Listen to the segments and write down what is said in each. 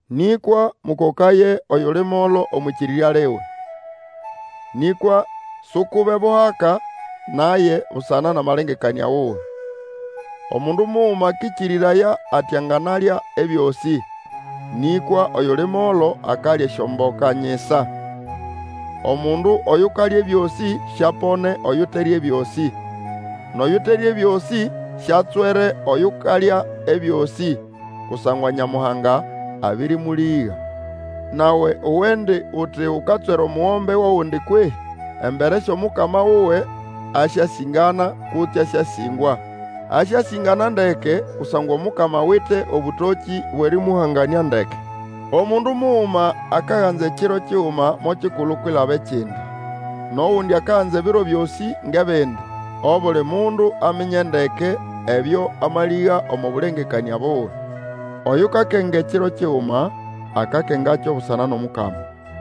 Nĩkwa mũkokaye oyuli molo omwʼĩkĩrĩrya liwe. Nĩkwa sukube buhaka naye busana nʼamalengekanĩa wuwe. Omundu muguma akĩkĩrĩraya ati anganalya ebyosĩ, nĩkwa oyuli molo akalya esyomboka nyisa. Omundu oyukalya ebyosĩ siapone oyuterya ebyosĩ. Nʼoyuterya ebyosĩ siatswere oyukalya ebyosĩ, kusangwa Nyamuhanga abĩrĩmũlĩga. Nawe uwendi uti ukatswera omugombe wʼogundi kwehĩ? Embere syʼOmukama wuwe asyasĩngana kutse asyasĩngwa. Asyasĩngana ndeke kusangwa Omukama awite obũtokĩ bwʼerĩmũhanganĩa ndeke. Omundu muguma akaganza ekiro kiguma mo kikulu kwilaba ekindi, nʼogundi akaganza ebiro byosĩ ngʼebindi. Obuli mundu aminye ndeke ebyo amalĩga omo bũlengekanĩa buwe. Oyukakenga ekiro kiguma, akakengakyo busana nʼomukama.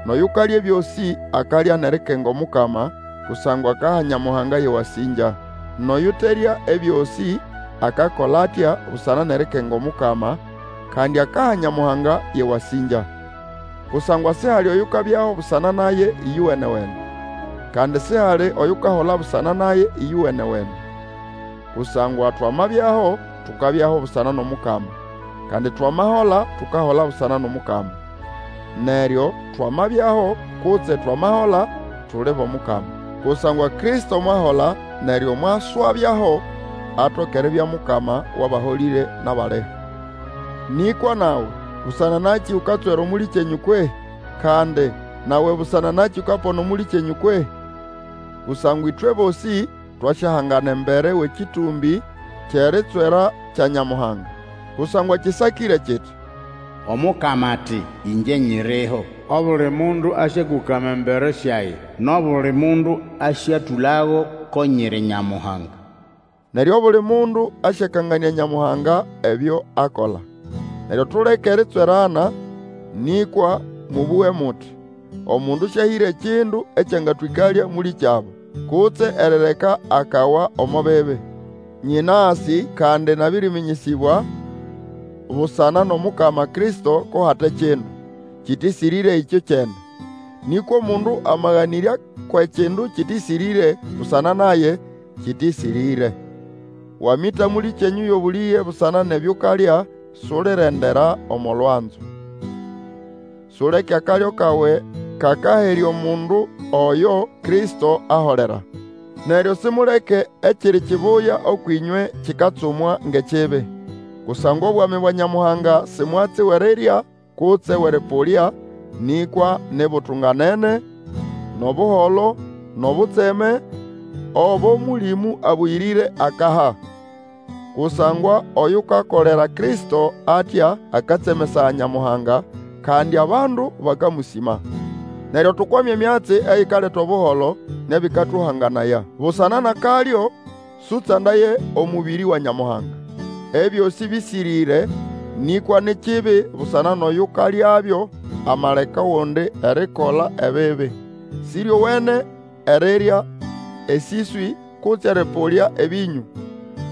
Nʼoyukalya ebyosĩ akalya nʼerikenga Omukama, kusangwa akaha Nyamuhanga yʼewasĩngya; nʼoyuterya ebyosĩ akakola atya busana nʼerikenga Omukama, kandi akaha Nyamuhanga yʼewasĩngya. Kusangwa sihali oyukabyaho busana naye ĩyowene-wene, kandi sihali oyukahola busana naye ĩyowenewene. Kusangwa twamabyaho tukabyaho busana nʼomukama, kandi twamahola tukahola busana nʼomukama. Neryo, twamabyaho kutse twamahola, tuli bʼOmukama. Kusangwa Kristo mwahola neryo mwaswabyaho, atoke eribya Mukama wʼabaholĩre nʼabaliho. Nĩkwa nawe, busana nakĩ ukatswera mũlĩkyenyũ kwehĩ? Kandi nawe busana nakĩ ukapona mũlĩkyenyũ kwehĩ? Kusangwa ĩtwe bosĩ twasyahangana embere wʼekĩtũmbĩ kyʼeritswera kya Nyamuhanga. Kusangwa kĩsakĩre kiti, Omukama ati, Ĩngye nyiriho! Obuli mundu asyakũkama embere syage, Nʼobuli mundu asyatũlago ko nyiri Nyamuhanga. Neryo obuli mundu asyakanganĩa Nyamuhanga ebyo akola. Neryo tuleke eritswerana, nĩkwa mũbũge muti, omundu sĩahĩre kindu ekyangatwĩkalya mũlĩkyabo, kutse erireka akawa omo bibi. Nyĩnasĩ, kandi nabĩrĩmĩnyĩsĩbwa busana nʼomukama Kristo ko hate kindu kĩtĩsĩrĩre ĩkyokyene; nĩkwa omundu amaganĩrya kwʼekindu kĩtĩsĩrĩre, busana naye, kĩtĩsĩrĩre. Wamĩta mũlĩkyenyũ yʼobũlĩge busana nʼebyo ukalya, sulirendera omo lwanzo. Suleke akalyo kawe kakaherya omundu oyo Kristo aholera. Neryo simuleke ekiri kibuya ũkwʼĩnywe kikatsumwa ngʼekibi. Kusangwa obwami bwa Nyamuhanga si mwatsi wʼerirya kutse wʼerĩpũlya, nĩkwa ni butunganene, nʼobuholo, nʼobutseme obo Mũlĩmũ Abũyĩrĩre akaha. Kusangwa oyukakolera Kristo atya akatsemesaya Nyamuhanga, kandi abandu bakamũsĩma. Neryo tukwame emyatsi eyikaleta Obuholo nʼebĩkatũhanganaya. Busana nʼakalyo Sũtsandaye omũbĩrĩ wa Nyamuhanga. Ebyosĩ bĩsĩrĩre, nĩkwa ni kibi busana nʼoyukalyabyo amaleka ogundi erikola ebibi. Sĩryowene erirya esĩswĩ kutse erĩpũlya ebĩnyũ,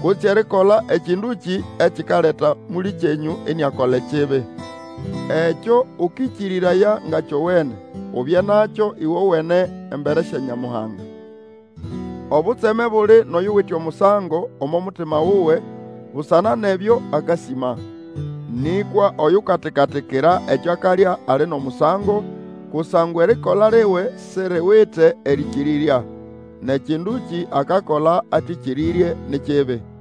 kutse erikola ekĩndũkĩ ekikaleka mũlĩkyenyũ iniakola ebibi. Ekyo ũkĩkĩrĩraya nga kyowene, ubye nakyo ĩwowene embere sya Nyamuhanga. Obutseme buli nʼoyute nʼomusango omo mutima wuwe busana nʼebyo akasĩma. Nĩkwa oyukatika-tikira ekyo akalya ali nʼomusango, kusangwa erikola liwe siriwite erĩkĩrĩrya. Nʼekĩndũkĩ akakola atĩkĩrĩrye ni kibi.